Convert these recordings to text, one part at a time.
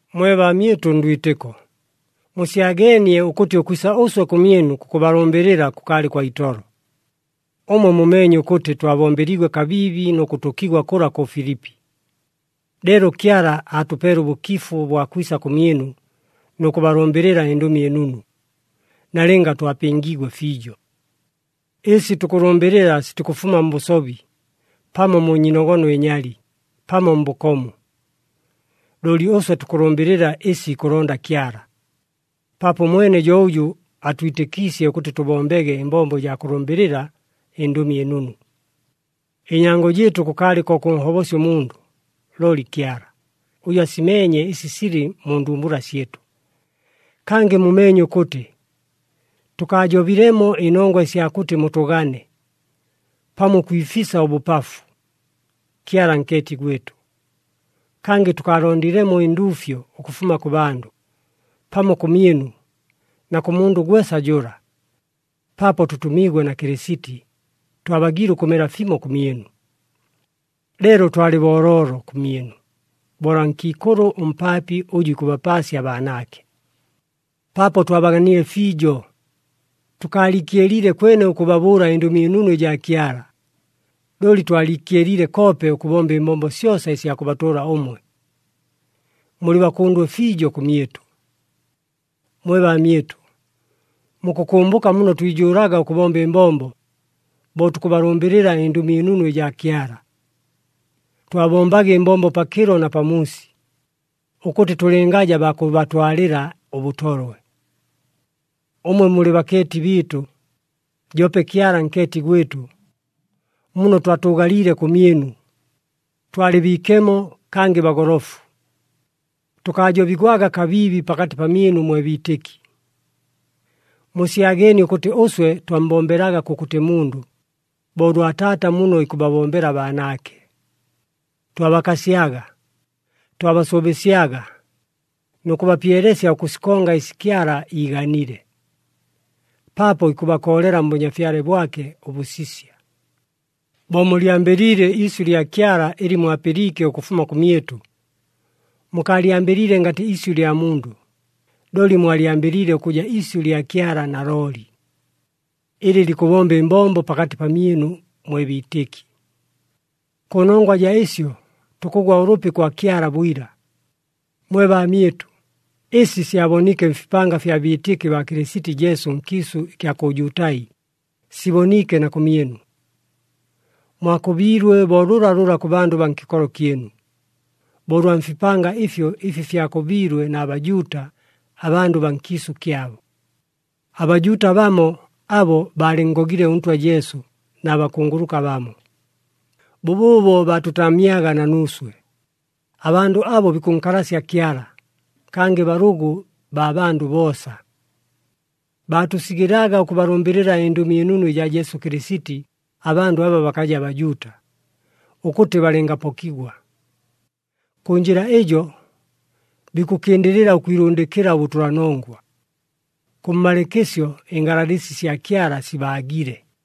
Mwe baamyɨtʉ ndwitɨko, musyageenie ʉkʉtɨ ʉkwisa ʉswe kʉmyɨnu kʉkʉbalʉmbɨlɨla kʉkaalɨ kwa itolo. Ʉmwe mumeenye ʉkʉtɨ twabombeliigwe kabiibi nʉ kʉtʉkigwa kʉla kʉ Filipi. Leelo Kyala aatʉpeele ʉbʉkifu ʉbwa kwisa kʉmyɨnu nʉ kʉbalʉmbɨlɨla ɨNdʉmi ɨNunu, nalɨnga twapɨngiigwe fiijo. Ɨsi tukʉlʉmbɨlɨla sitikʉfuma mbʉsobi, pamo mu nyiinogono ɨnyali, pamo mbʉkomu. Looli ʉswe tukʉlʉmbɨlɨla ɨsi ikʉlonda Kyala, paapo ʉmwene jo ʉjʉ aatwitɨkiisye ʉkʉtɨ tʉbombege ɨmbombo ɨjaa kʉlʉmbɨlɨla ɨNdʉmi ɨNunu. Ɨnyango jɨɨtʉ kʉkaalɨ ko kʉnhobosya ʉmundʉ, looli Kyala, ʉjʉ asimeenye ɨsi silɨ mu ndumbula syɨtʉ. Kangɨ mumeenye ʉkʉtɨ, tʉkaajobilemo ɨnongwa ɨsya kʉtɨ mutʉgane, pamo ʉkwifisa ʉbʉpafu. Kyala nkeeti gwɨtʉ! Kangɨ tʉkaalondilemo ɨnduufyo ʉkʉfuma kʉ bandʉ, pamo kʉmyɨnu na kʉ mundʉ gwesa jʉla. Paapo tʉtʉmiigwe na Kɨlɨsiti, twabagiile ʉkʉmela fimo kʉmyɨnu, leelo twalɨ booloolo kʉmyɨnu bo ʉlwa nkiikʉlʉ ʉmpaapi ʉjʉ ikʉbapaasya abaanaake. Paapo twabaganile fiijo, tʉkaaliikyeliile kwene ʉkʉbabʉʉla ɨNdʉmi ɨNunu ɨjaa Kyala, looli twaliikyeliile koope ʉkʉbomba ɨmbombo syosa ɨsya kʉbatʉʉla ʉmwe. Mulɨ bakʉndwe fiijo kʉmyɨtʉ. Mwe baamyɨtʉ! Mukʉkʉmbʉka muno twijʉʉlaga ʉkʉbomba ɨmbombo, bo tukʉbalʉmbɨlɨla ɨNdʉmi ɨNunu ɨjaa Kyala. Twabombaga ɨmbombo pakɨlo na pamuusi, ʉkʉtɨ tʉlɨngaja baa kʉbatwalɨla ʉbʉtolwe. Ʉmwe mulɨ bakeeti bɨɨtʉ, joope Kyala nkeeti gwɨtʉ, muno twatʉʉgaliile kʉmyɨnu, twalɨ biikemo kangɨ bagolofu. Tʉkaajobigwaga kabiibi pakatɨ pamyɨnu mwe biitɨki. Musyageenie ʉkʉtɨ ʉswe twammbombelaga kʉkʉtɨ mundʉ, bo ʉlwa taata muno ikʉbabombela abaanaake. Twabakasyaga, twabasʉʉbɨsyaga nʉ kʉbapyelesya ʉkʉsikonga ɨsi Kyala iiganile, paapo ikʉbakoolela mBʉnyafyale bwake ʉbʉsisya. Bo mulyambɨliile iisyʉ lya Kyala ɨlɨ mwapɨliike ʉkʉfuma kʉmyɨtʉ, mukaalyambɨliile ngatɨ isyʉ lya mundʉ, looli mwalyambɨliile ʉkʉja isyʉ lya Kyala nalooli, ɨlɨ likʉbomba ɨmbombo pakatɨ pamyɨnu mwe biitɨki. Kʉnongwa jaa ɨsyo tukʉgwa ʉlʉpi kwa Kyala bwila. Mwe baamyɨtʉ, ɨsi syaboniike mfipanga fya biitɨki baa Kɨlɨsiti Jesu nkiisʉ ɨkya kʉ Jutai, siboniike na kʉmyɨnu. Mwakʉbiilwe bo lʉlalʉla kʉ bandʉ baa nkɨkolo kyɨnu, bo ʉlwa mfipanga ɨfyo ɨfi fyakʉbiilwe na Bajuuta, abandʉ baa nkiisʉ kyabo. ABajuuta bamo abo baalɨnngogile ʉNtwa Jesu na bakunguluka bamo. Bʉbʉʉbo baatʉtaamyaga na nuuswe. Abandʉ abo bikʉnkalasya Kyala, kangɨ balʉgʉ baa bandʉ boosa. Baatʉsigɨlaga ʉkʉbalʉmbɨlɨla ɨNdʉmi ɨNunu ɨjaa Jesu Kɨlɨsiti abandʉ aba bakaja Bajuuta, ʉkʉtɨ balɨngapokigwa. Kʉ njɨla ɨjo, bikʉkɨndɨlɨla ʉkwilʉndɨkɨla ʉbʉtʉlanongwa. Kʉmmalɨɨkɨsyo ɨngalalɨsi sya Kyala sibaagile!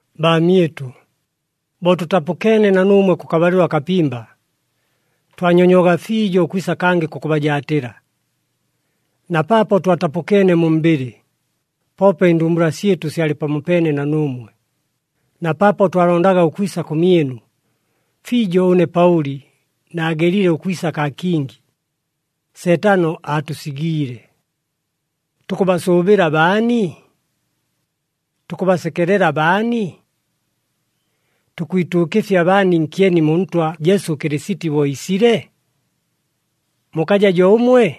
Baamyɨtʉ, bo tʉtapʉkeene na nuumwe kʉkabalɨlo akapimba, twanyonywaga fiijo ʉkwisa kangɨ kʉkʉbajaatɨla. Na paapo twatapʉkeene mu mbɨlɨ, poope ɨndumbula syɨtʉ syalɨ pamopeene na nuumwe. Na paapo twalondaga ʉkwisa kʉmyɨnu, fiijo ʉne Paʉli naagelile ʉkwisa kaa kingi, Seetano aatʉsigiile. Tukʉbasʉʉbɨla baani? Tukʉbasekelela baani? Tukwituukɨfya baani nkyeni mu Ntwa Jesu Kɨlɨsiti bo iisile? Mukaja jo ʉmwe?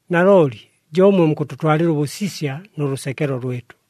Nalooli jo ʉmwe mukʉtʉtwalɨla ʉbʉsisya nʉ lʉsekelo lwɨtʉ.